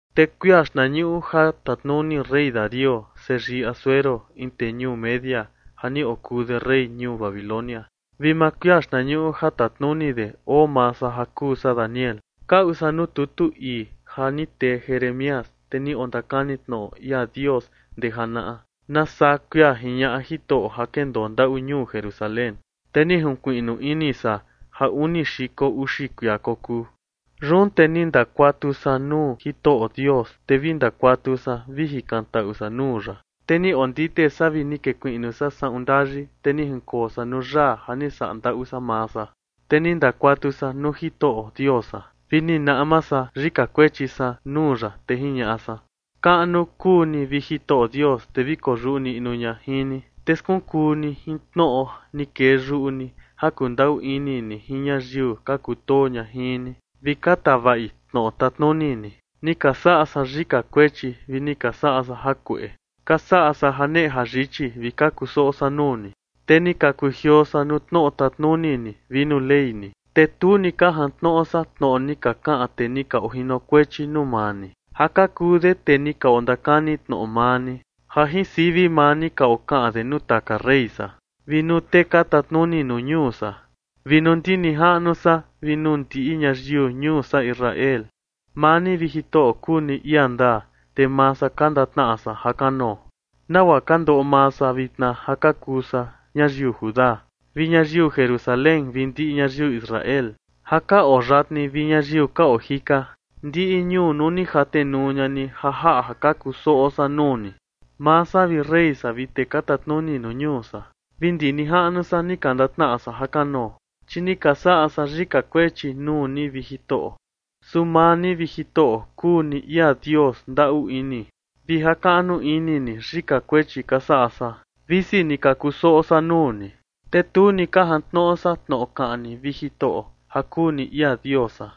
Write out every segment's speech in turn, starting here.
Te kuia xtnañuꞌu ja tatnuni rey Darío, seyii Asuero, in tee ñuu Media ja ni okuu de rey ñuu Babilonia, vi maa kuia xtnañuꞌu ja tatnuni de, oo maa san ja kuu san Daniel, kaꞌu san nuu tutu ii ja ni tee Jeremías, tee ni ondakani tnoꞌo ia Dios ndee janaꞌa, nasaa kuia jiñaꞌa Jitoꞌo ja kendoo ndaꞌu ñuu Jerusalén. Te ni jinkuiꞌnu ini san ja uni xiko uxi kuia kokuu. Yun te ni ndakuatu san nuu Jitoꞌo Dios, te vi ndakuatu san vi jikantaꞌu san nuu ya, te ni ondite san vi ni kekuiꞌnu san saꞌun ndayi, te ni jinkoo san nuu yaa ja ni saꞌa ndaꞌu san maa san. Te ni ndakuatu san nuu Jitoꞌo Dios san, vi ni naꞌma san yika kuechi san nuu ya, te jiñaꞌa san: ―Kaꞌnu kuu ni, vi Jitoꞌo Dios, te vi koyuꞌu niꞌnu ña jin ni, te skunkuu ni jin tnoꞌo ni kee yuꞌu ni ja kundaꞌu ini ni jin ñayiu ka kutoo ña jin ni, vi ka tavaꞌi tnoꞌo tatnuni ni. Ni ka saꞌa san yika kuechi vi ni ka saꞌa san jakueꞌe, ka saꞌa san janeꞌe jayichi, vi ka kusoꞌo san nuu ni. Te ni ka kujioo san nuu tnoꞌo tatnuni ni vi nuu Ley ni. Te tu ni ka jantnoꞌo san tnoꞌo ni ka kaꞌan tee ni ka ojinokuechi nuu maa ni, ja ka kuu de tee ni ka ondakani tnoꞌo maa ni, ja jin sivi maa ni ka okaꞌan de nuu taka rey san, vi nuu tee ka tatnuni nuu ñuu san, vi nuu ndi nijaꞌnu san vi nuu ndiꞌi ñayiu ñuu san Israel. Maa ni, vi Jitoꞌo, kuu ni ia ndaa, te maa san ka ndatnaꞌa san ja kanoo, nagua ka ndoꞌo maa san vitna ja ka kuu san ñayiu Judá, vi ñayiu Jerusalén, vi ndiꞌi ñayiu Israel, ja ka oo yatni vi ñayiu ka oo jika, ndiꞌi ñuu nuu ni jatenuu ña ni, ja jaꞌa ja ka kusoꞌo san nuu ni. Maa san, vi rey san, vi tee ka tatnuni nuu ñuu san, vi ndi nijaꞌnu san, ni ka ndatnaꞌa san jakanoo, chi ni ka saꞌa san yika kuechi nuu ni, vi Jitoꞌo. Su maa ni, vi Jitoꞌo, kuu ni ia Dios ndaꞌu ini, vi jakaꞌnu ini ni yika kuechi ka saꞌa san, visi ni ka kusoꞌo san nuu ni. Te tu ni ka jantnoꞌo san tnoꞌo kaꞌan ni, vi Jitoꞌo, ja kuu ni ia Dios san,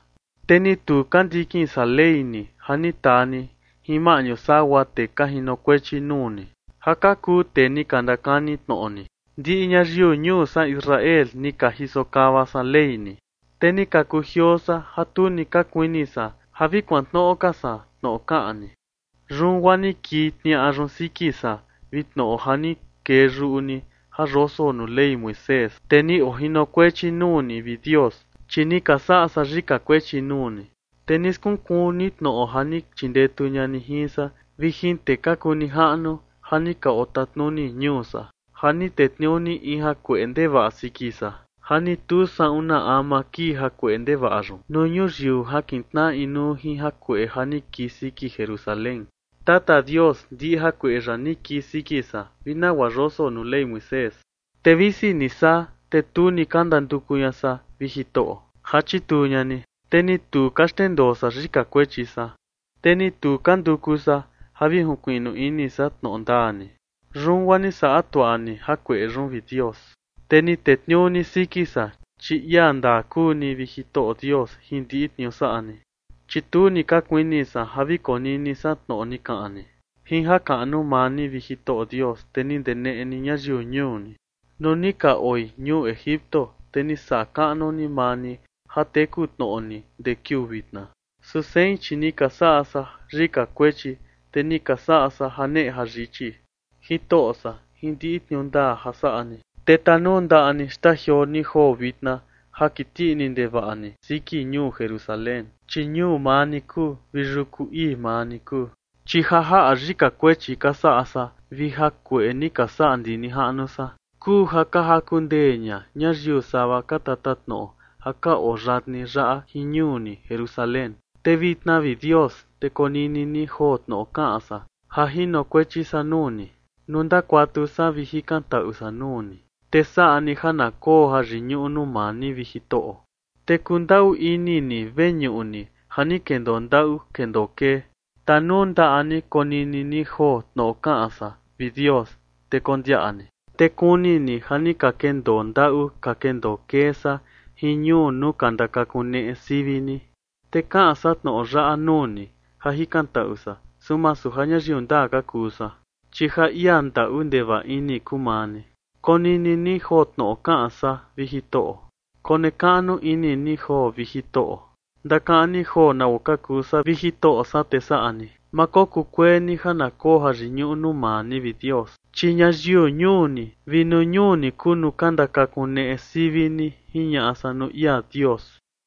te ni tu ka ndikin san Ley ni, ja ni taa ni jin maꞌñu sagua tee ka jinokuechi nuu ni, ja ka kuu tee ni ka ndakani tnoꞌo ni. Ndiꞌi ñayiu ñuu san Israel ni ka jiso kava san Ley ni, te ni ka kujioo san ja tu ni ka kuini san ja vi kuantnoꞌo ka san tnoꞌo kaꞌan ni. Yun guaa ni kii tniaꞌa yun siki san vi tnoꞌo ja ni kee yuꞌu ni ja yoso nuu Ley Moisés, tee ni ojinokuechi nuu ni, vi Dios, chi ni ka saꞌa san yika kuechi nuu ni. Te ni skunkuu ni tnoꞌo ja ni chindetu ña ni jin san vi jin tee ka kuu nijaꞌnu ja ni ka otatnuni ñuu san, ja ni tetniuu ni in jakueꞌe ndevaꞌa siki san, ja ni tu saꞌun na ama kii jakueꞌe ndevaꞌa yun nuu ñuyiu ja kitnaꞌa inuu jin jakueꞌe ja ni kii siki Jerusalén. Tata Dios, ndiꞌi jakueꞌe yaꞌa ni kii siki san, vi nagua yoso nuu Ley Moisés, te visi ni saa, te tu ni ka ndanduku ña san, vi Jitoꞌo, ja chituu ña ni. Te ni tu ka xndendoo san yika kuechi san, te ni tu ka nduku san ja vi jinkuiꞌnu ini san tnoꞌo ndaa ni. Yun guaa ni saꞌa tuaꞌa ni jakueꞌe yun, vi Dios, te ni tetniuu ni siki san, chi ia ndaa kuu ni, vi Jitoꞌo Dios, jin ndiꞌi tniuu saꞌa ni, chi tu ni ka kuini san ja vi konini san tnoꞌo ni kaꞌan ni. ’Jin jakaꞌnu maa ni, vi Jitoꞌo Dios, te ni ndeneꞌe ni ñayiu ñuu ni, nuu ni ka oi ñuu Egipto, te ni saꞌa kaꞌnu ni maa ni ja teku tnoꞌo ni ndee kiuu vitna. Su sein, chi ni ka saꞌa san yika kuechi, te ni ka saꞌa san janeꞌe jayichi. Jitoꞌo san, jin ndiꞌi tniuu ndaa ja saꞌa ni, te tanundaꞌa ni xtajioo ni joo vitna ja kiti ini ndevaꞌa ni siki ñuu Jerusalén, chi ñuu maa ni kuu, vi yuku ii maa ni kuu. Chi ja jaꞌa yika kuechi ka saꞌa san vi jakueꞌe ni ka saꞌa ndi nijaꞌnu san, kuu ja ka jaku ndee ña ñayiu sava ka tatatnoꞌo ja ka oo yatni yaꞌa jin ñuu ni, Jerusalén. Te vitna, vi Dios, te konini ni joo tnoꞌo kaꞌan san ja jinokuechi san nuu ni, nuu ndakuatu san vi jikantaꞌu san nuu ni. Te saꞌa ni ja na koo jayiñuꞌu nuu maa ni, vi Jitoꞌo, te kundaꞌu ini ni veñuꞌu ni ja ni kendoo ndaꞌu kendoo kee. Tanundaꞌa ni konini ni joo tnoꞌo kaꞌan san, vi Dios, te kondiaꞌa ni, te kuni ni ja ni ka kendoo ndaꞌu ka kendoo kee san jin ñuu nuu ka ndakakuneꞌe sivi ni. Te kaꞌan san tnoꞌo yaꞌa nuu ni ja jikantaꞌu san, su masu ja ñayiu ndaa ka kuu san, chi ja ia ndaꞌu ndevaꞌa ini kuu maa ni. Konini ni joo tnoꞌo kaꞌan san, vi Jitoꞌo. Konekaꞌnu ini ni joo, vi Jitoꞌo. Ndakaꞌan ni joo nagua ka kuu san, vi Jitoꞌo san, te saꞌa ni. Ma kokuu kuee ni ja na koo jayiñuꞌu nuu maa ni, vi Dios, chi ñayiu ñuu ni, vi nuu ñuu ni kuu nuu ka ndakakuneꞌe sivi ni ―jiñaꞌa san nuu ia Dios.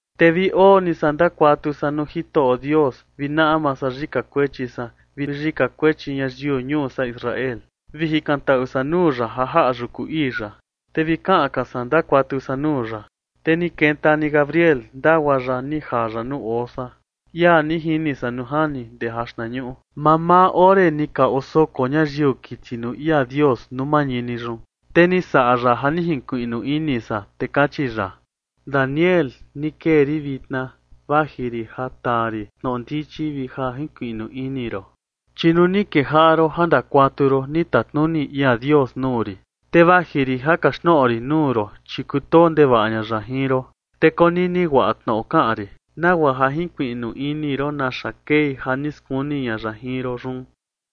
Te vi oo ni san ndakuatu san nuu Jitoꞌo Dios, vi naꞌma san yika kuechi san vi yika kuechi ñayiu ñuu san Israel, vi jikantaꞌu san nuu ya ja jaꞌa yuku ii ya. Te vi kaꞌan ka san ndakuatu san nuu ya, te ni kenta ni Gabriel, ndagua ya ni jaa ya nuu oo san, ia ni jini san nuu jani ndee jaxtnañuꞌu, mamaa ore ni ka osoko ñayiu kiti nuu ia Dios nuu mañini yun. Te ni saꞌa ya ja ni jinkuiꞌnu ini san, te kachi ya: ―Daniel, ni kee rin vitna vaji rin ja taa rin tnoꞌo ndichi vi ja jinkuiꞌnu ini ron. Chi nuu ni kejaꞌa ron ja ndakuatu ron, ni tatnuni ia Dios nuu rin, te vaji rin ja kaxtnoꞌo rin nuu ron, chi kutoo ndevaꞌa ña ya jin ron. Te konini guaꞌa tnoꞌo kaꞌan rin, nagua ja jinkuiꞌnu ini ron naxa kei ja ni skuni ña ya jin ron yun.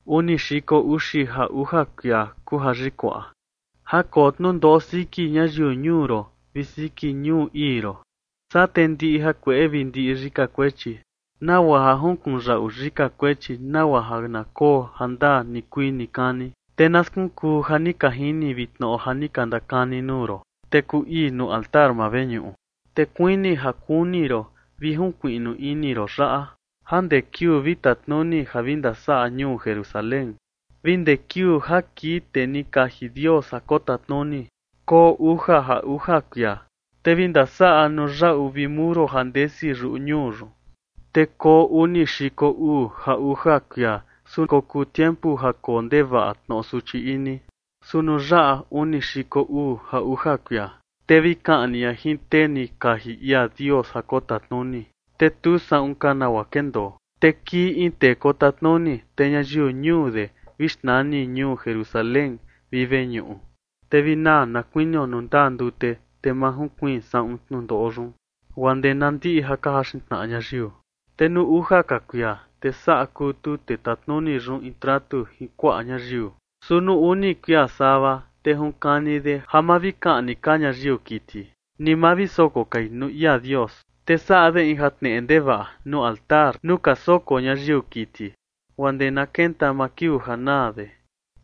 Uni xiko uxi ja uja kuia kuu ja yikuaꞌa, ja koo tnundoꞌo siki ñayiu ñuu ron vi siki ñuu ii ron. Saa te ndiꞌi jakueꞌe vi ndiꞌi yika kuechi, nagua ja junkunyaꞌu yika kuechi, nagua ja na koo jandaa nikuii nikani, te na skunkuu ja ni ka jini vi tnoꞌo ja ni ka ndakani nuu ron, te kuu ii nuu altar maa veñuꞌu. Te kuini ja kuni ron vi jinkuiꞌnu ini ron yaꞌa: Ja ndee kiuu vi tatnuni ja vi ndasaꞌa ñuu Jerusalén vi ndee kiuu ja kii tee ni kaji Dios ja kotatnuni, koo uja ja uja kuia. Te vi ndasaꞌa nuu yaꞌu vi muro ja ndesi yuꞌu ñuu yun, te koo uni xiko uu ja uja kuia, su kokuu tiempu ja koo ndevaꞌa tnoꞌo suchi ini. Su nuu yaꞌa uni xiko uu ja uja kuia, te vi kaꞌni ña jin tee ni kaji ia Dios ja kotatnuni, te tu saꞌun ka nagua kendoo. Te kii in tee kotatnuni, te ñayiu ñuu de vi xnani ñuu Jerusalén vi veñuꞌu. Te vi naa na kuinio nuu ndaa ndute, te ma junkuiin saꞌun tnundoꞌo yun, guaa ndee na ndiꞌi ja ka jaxin tnaꞌa ñayiu. Te nuu uja ka kuia, te saꞌa kutu tee tatnuni yun in tratu jin kuaꞌa ñayiu. Su nuu uni kuia sava, te junkani de ja ma vi kaꞌni ka ñayiu kiti, ni ma vi soko kai nuu ia Dios. Te saꞌa de in jatneꞌe ndevaꞌa nuu altar nuu ka soko ñayiu kiti, guaa ndee na kenta maa kiuu ja naa de,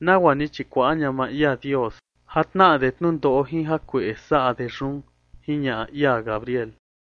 nagua ni chikuaꞌa ña maa ia Dios, ja tnaꞌa de tnundoꞌo jin jakueꞌe saꞌa de yun ―jiñaꞌa ia Gabriel.